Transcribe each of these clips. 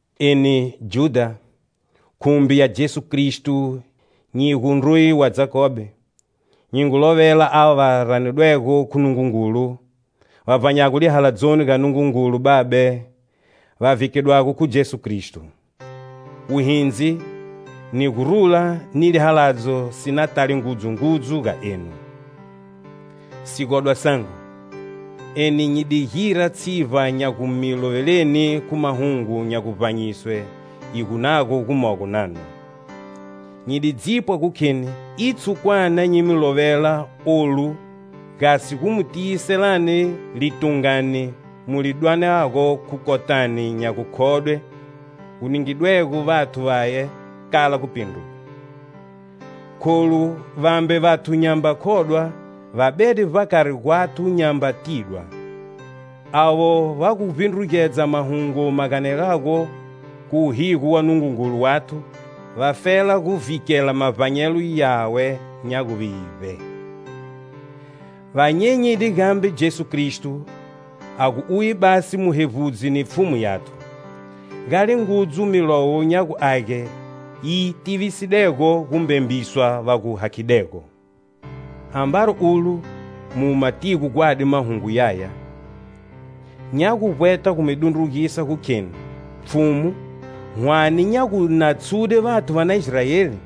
Eni, Judha, khumbi ya Jesu Kristo nyi gu ndruye wa Jakobe, nyi ngu lovela ava va ranidwego khu Nungungulu, va vbanyago lihaladzoni ga Nungungulu Babe, va vhikedwago khu Jesu Kristo. Wuhindzi, ni gurula ni lihaladzo si na tale ngudzu ngudzu ga enu. Sigodwa sangu, eni nyi di gira tshivba nya gu mi loveleni khu mahungu nya guvbanyiswe hi gu nago gumogo nanu. Nyi di dzipwa gu kheni i tshukwana nyi mi lovela olu gasi gu mi tiyiselani litungani mu li dwanago khu kotani nya gukhodwe gu ningidwego vathu vaye kala gupindruga. Kholu vambe vathu nyamba khodwa va bede vbakari gwathu nyamba tidwa. Avo va gu vbindrugedza mahungu ma ganelago khu wuhigo wa Nungungulu wathu, vafela gu vhikela mavbanyelo yawe nya guvivbe. Va nyenyide gambe Jesu Kristo a gu uye basi Muhevbudzi ni Pfhumu yathu. Gale ngudzu Milowo nya gu Age yi tivisidego gumbembiswa va gu hakhidego. Ambari ulo mu matigo gwadi mahungu yaya, nya gu vbweta gu mi dundrugisa gu kheni Pfhumu hwane nya gu na tshude vathu va na Israeli,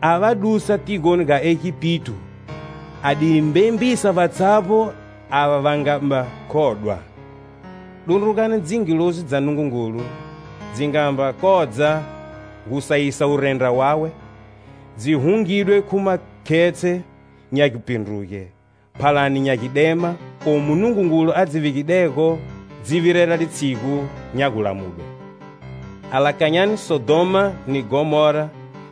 a va dusa tigoni ga Egipito, a di mbembisa vatshavbo ava va nga mba khodwa. Dundrugani dzingilozi dza Nungungulu si nga mba kodza gu sayisa wurendra wawe, dzi hungidwe khu makhetshe nya gupindruge, phalani nya gidema, omu Nungungulu a dzi vegidego dzi virela litshigu nya gulamudwe. Alakanyani Sodhoma ni Ghomora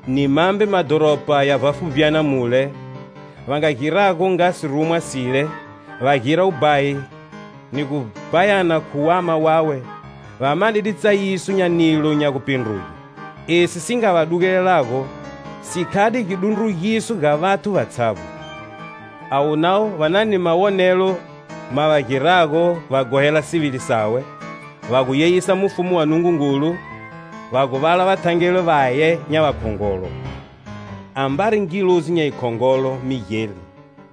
ni mambe madhoropa ya vbafuvbyana mule, a nga girago nga sirumwa sile, va gira wubhayi, ni gu bhayana khu wama wawe, va manide tsayiso nya nilo nya gupindruge. Esi si nga va dugelelago, si khade gidundrugiso ga vathu vatshavbo. Avo navo va na ni mawonelo ma va girago va ghohela sivili sawe; va gu yeyisa Mufumu wa Nungungulu, va gu vala vathangeli vaye nya vakhongolo. Ambari ngilozi nya yikhongolo, Migeli,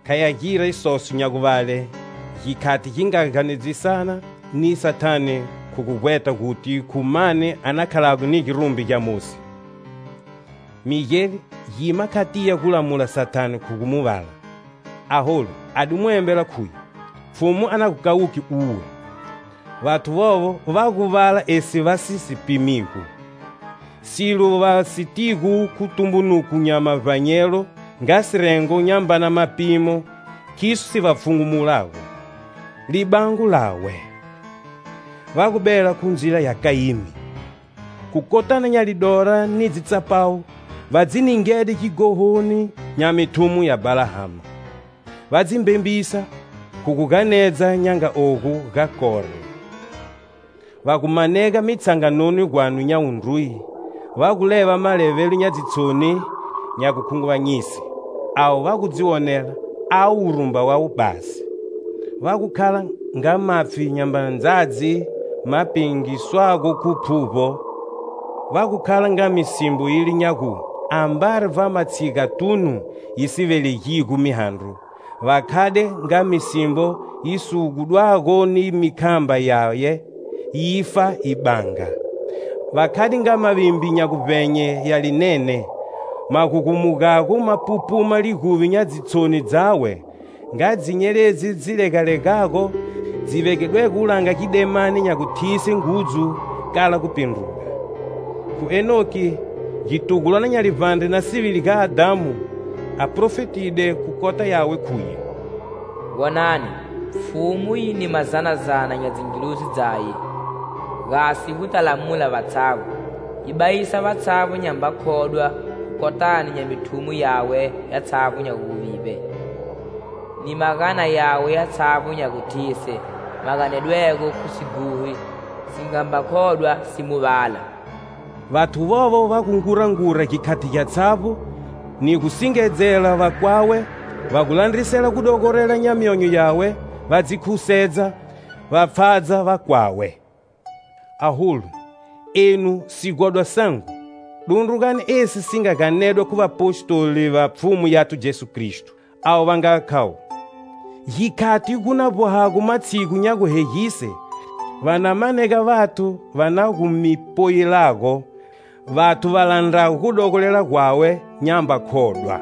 kha gya gira isoso nya guvale, gikhati gi nga ganedzisana ni Sathane khu gu vbweta guti khu mani a na khalago ni girumbi gya Mosi. Migeli gima kha tiya gulamula Sathane khu gu mu vala. Aholu, a di mu embela khuye: "Pfhumu a na gu kawuke uwe." Vathu vovo va gu vala esi va si si pimigo. Silo va sitigo khu tumbunuko nya mavbanyelo nga sirengo nyambana mapimo khiso si va pfhungumulago. Libango lawe! Va gu bela khu ndzila ya Kayimi. Khu kotani nya lidora ni dzitsapawu va dzi ningede gighohoni nya mithumo ya Bhalahama; va dzi mbembisa khu gu ganedza nya nga ogu ga Kore. Va gu manega mitshanganoni gwanu nya wundruye, va gu leva malevelo nya dzitshoni, nya gukhunguvanyise. Avo va gu dzi wonela avo wurumba wawe basi. Va gu khala nga mapfhi nyambana ndzadzi ma pengiswago khu phuvbo; va gu khala nga misimbo yile nya gu, ambari vbamatshigatunu yi si velegigo mihandro; va khade nga misimbo yi sigudwago ni mikhamba yaye, yifa yi banga. Va khade nga mavimbi nya guvbenye ya linene, ma gugumugago ma pupuma liguvi nya dzitshoni dzawe; nga dzinyeledzi dzi legalegago, dzi vegedwego wulanga gidemani nya guthise ngudz, kala gupindruga. Khu Henoki, gitugulwana nya livbandre na sivili ga Adhamu, a profetide khu kota yawe khuye: "Wonani, Pfhumu yi ni mazanazana nya dzingilozi dzaye, gasi, guta lamula vatshavbo. Yi bayisa vatshavbo va nyamba khodwa khu kotani nya mithumo yawe yatshavbo nya guvivbe, ni magana yawe yatshavbo nya guthise ma ganedwego khu sighohi si ngamba khodwa si Mu vala." Vathu vovo va gu ngurangura gikhati gyatshavbo ni gu singedzela vakwawe, va gu landrisela gudogorela nya myonyo yawe, va dzi khusedza, va pfhadza vakwawe. Aholu, enu, sigodwa sangu, dundrugani esi si nga ganedwa khu vapostoli va Pfhumu yathu Jesu Kristo. Avo va nga khavo: "Gikhati gu na vbohago matshigu nya guhegise, va na manega vathu va na gu mi poyilago; vathu va landrago gudogolela gwawe nyamba khodwa."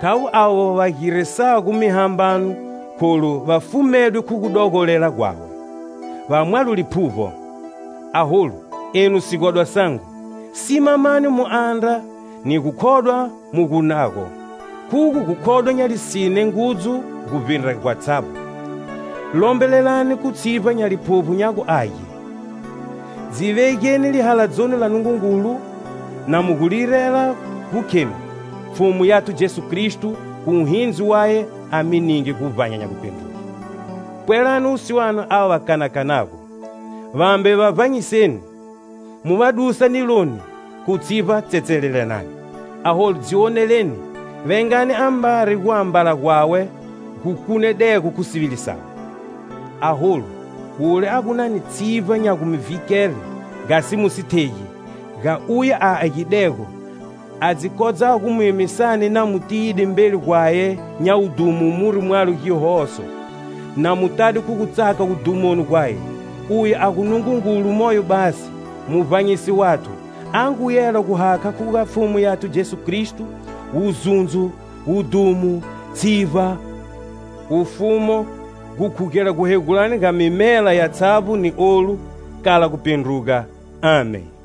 Khavo avo va girisago mihambano kholu va fumedwe khu gudogolela gwawe. Va mwalo Liphuvbo. Aholu, enu sigodwa sangu, simamani mu andra ni gukhodwa mu gu nago; khugo gukhodwa nya lisine ngudzu guvbindra gwatshavbo. Lombelelani khu tshivba nya Liphuvbo nya gu Age. Dzi vegeni lihaladzoni la Nungungulu, na mu gu lirela gu khenu, Pfhumu yathu Jesu Kristo, khu wuhindzi waye a mi ninge guvbanya nya gupindruge. Pwelani wusiwana ava va kanakanago, vambe va vbanyiseni, mu va dusa niloni; khu tshivba tsetselelani. Aholu dzi wonelani, vengani ambari guambala gwawe gu kunedego khu sivili sawe. Aholu wule a gu na ni tshivba nya gu mi vhikele, gasi mu si thegi; ga uye a agidego, a dzi kodzago gu mi emisani na mu tiyide mbeli gwaye nya wudhumo muri mwalo gihoso, na mu tade khu gutsaka wudhumoni gwaye; Uye a gu Nungungulu moyo basi, Muvbanyisi wathu, a ngu yela gu hakha khu ga Pfhumu yathu Jesu Kristo: Wuzundzo, wudhumo, tshivba, wufumo gukhugela guhegulani ga mimela yatshavbo ni olu, kala gupindruga! Amen.